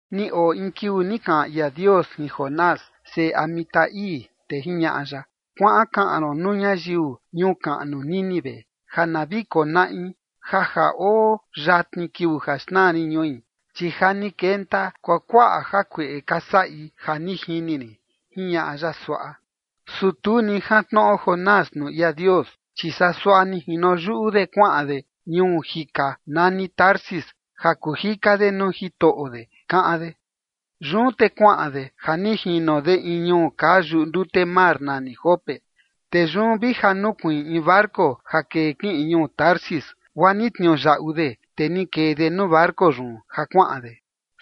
Ni oo in kiuu ni kaꞌan ia Dios jin Jonás, seꞌe Amitai, te jiñaꞌa ya: ―Kuaꞌan kaꞌan ron nuu ñayiu ñuu kaꞌnu Nínive ja na vi konaꞌi ja ja oo yatni kiuu ja xnaa rin ñui, chi ja ni kenta kuakuaꞌa jakueꞌe ka saꞌi ja ni jini rin ―jiñaꞌa ya suaꞌa. Su tu ni jantnoꞌo Jonás nuu ia Dios, chi saa suaꞌa ni jino yuꞌu de kuaꞌan de ñuu jika nani Tarsis ja kuu jika de nuu Jitoꞌo de kaꞌan de. Yun te kuaꞌan de ja ni jino de in ñuu kaa yuꞌu ndute mar nani Jope. Te yun vija nukuiin in barco ja kee kiꞌin ñuu Tarsis, guaa ni tniuyaꞌu de, te ni kee de nuu barco yun ja kuaꞌan de.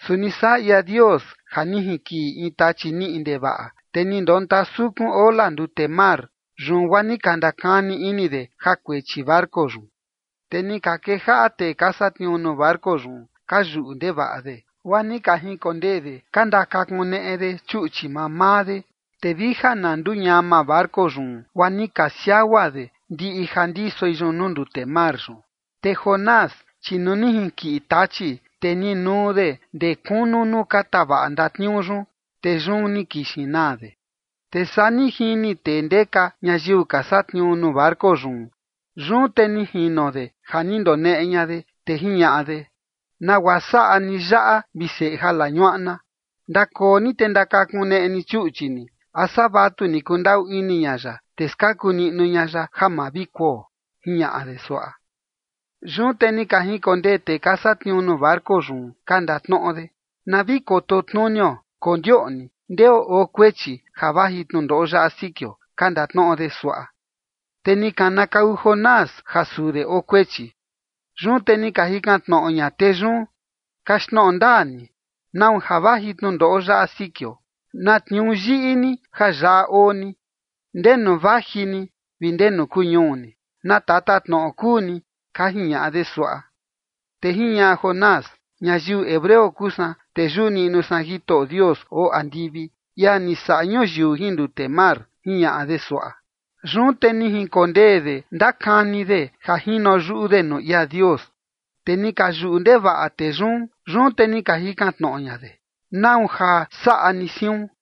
Su ni saꞌa ia Dios ja ni jinkiꞌi in tachi niꞌi ndevaꞌa, te ni ndonta sukun ola ndute mar. Yun guaa ni ka ndakani ini de ja kuechi barco yun. Te ni ka kejaꞌa tee ka satniuu nuu barco yun ka yuꞌu ndevaꞌa de, guaa ni ka jinkondee de ka ndakakuneꞌe de chuꞌchi maa maa de. Te vija na nduu ñama barco yun, guaa ni ka siagua de ndiꞌi ja ndisoi yun nuu ndute mar yun. Te Jonás, chi nuu ni jinkiꞌi tachi, te ni nuu de ndee kunu nuu ka tavaꞌa ndatniuu yun. Te yun ni kixin naa de. Te saa ni jini tee ndeka ñayiu ka satniuu nuu barco yun. Yun te ni jino de ja ni ndoneꞌe ña de, te jiñaꞌa de: ―¿Nagua saꞌa ni yaꞌa, vi seꞌe ja la ñuaꞌna? Ndakoo ni te ndakakuneꞌe ni chuꞌchi ni, a saa vatuni kundaꞌu ini ña ya, te skaku niꞌnu ña ya ja ma vi kuo ―jiñaꞌa de suaꞌa. Yun te ni ka jinkondee tee ka satniuu nuu barco yun ka ndatnoꞌo de: ―Na vi kototnunio kondioꞌni ndeo oo kuechi ja vaji tnundoꞌo yaꞌa sikio ―ka ndatnoꞌo de suaꞌa. Te ni kanakau Jonás ja suu de oo kuechi. Yun te ni ka jikan tnoꞌo ña tee yun: ―Kaxtnoꞌo ndaa ni, ¿nau ja vaji tnundoꞌo yaꞌa sikio? ¿Na tniuu yiꞌi ni ja yaꞌa oo ni? ¿Ndenu vaji ni vi ndenu kuu ñuu ni? ¿Na tatatnoꞌo kuu ni? ―ka jiñaꞌa de suaꞌa. Te jiñaꞌa Jonás: ―Ñayiu hebreo kuu san, te yuꞌu niꞌnu san Jitoꞌo Dios oo andivi, ia ni saꞌa ñuyiu jin ndute mar ―jiñaꞌa de suaꞌa. Yun te ni jinkondee de ndakani de ja jino yuꞌu de nuu ia Dios, te ni ka yuꞌu ndevaꞌa tee yun. Yun te ni ka jikan tnoꞌo ña de: ―¿Nau ja saꞌa ni siun?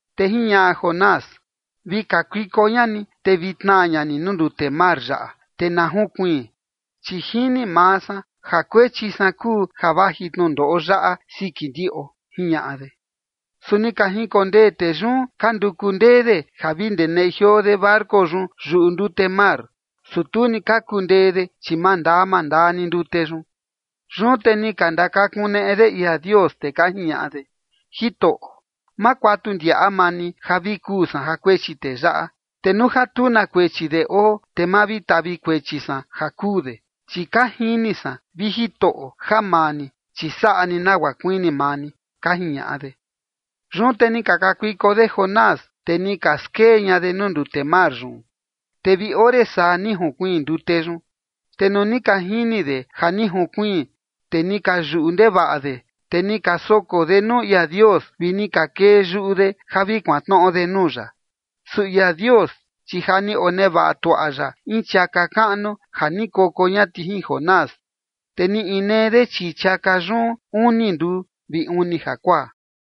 Te jiñaꞌa Jonás: ―Vi kakuiko ña ni, te vi tnaa ña ni nuu ndute mar yaꞌa, te na junkuiin, chi jini maa san ja kuechi san kuu ja vaji tnundoꞌo yaꞌa siki ndiꞌo ―jiñaꞌa de. Su ni ka jinkondee tee yun ka nduku ndee de ja vi ndeneꞌe jioo de barco yun yuꞌu ndute mar, su tu ni ka kundee de, chi mandaa mandaa ni ndute yun. Yun te ni ka ndakakuneꞌe de ia Dios, te ka jiñaꞌa de: ―Jitoꞌo, ma kuatu ndiaꞌa maa ni ja vi kuu san ja kuechi tee yaꞌa. Te nuu ja tu na kuechi de oo, te ma vi tavi kuechi san ja kuu de, chi ka jini san, vi Jitoꞌo, ja maa ni, chi saꞌa ni nagua kuini maa ni ―ka jiñaꞌa de. Yun te ni ka kakuiko de Jonás, te ni ka skee ña de nuu ndute mar yun, te vi ore saa ni junkuiin ndute yun. Te nuu ni ka jini de ja ni junkuiin, te ni ka yuꞌu ndevaꞌa de, te ni ka soko de nuu ia Dios, vi ni ka kee yuꞌu de ja vi kuantnoꞌo de nuu ya. Su ia Dios, chi ja ni onevaꞌa tuaꞌa ya in chiaka kaꞌnu ja ni koko ña ti jin Jonás, te ni inee de chii chiaka yun uni nduu vi uni jakuaa.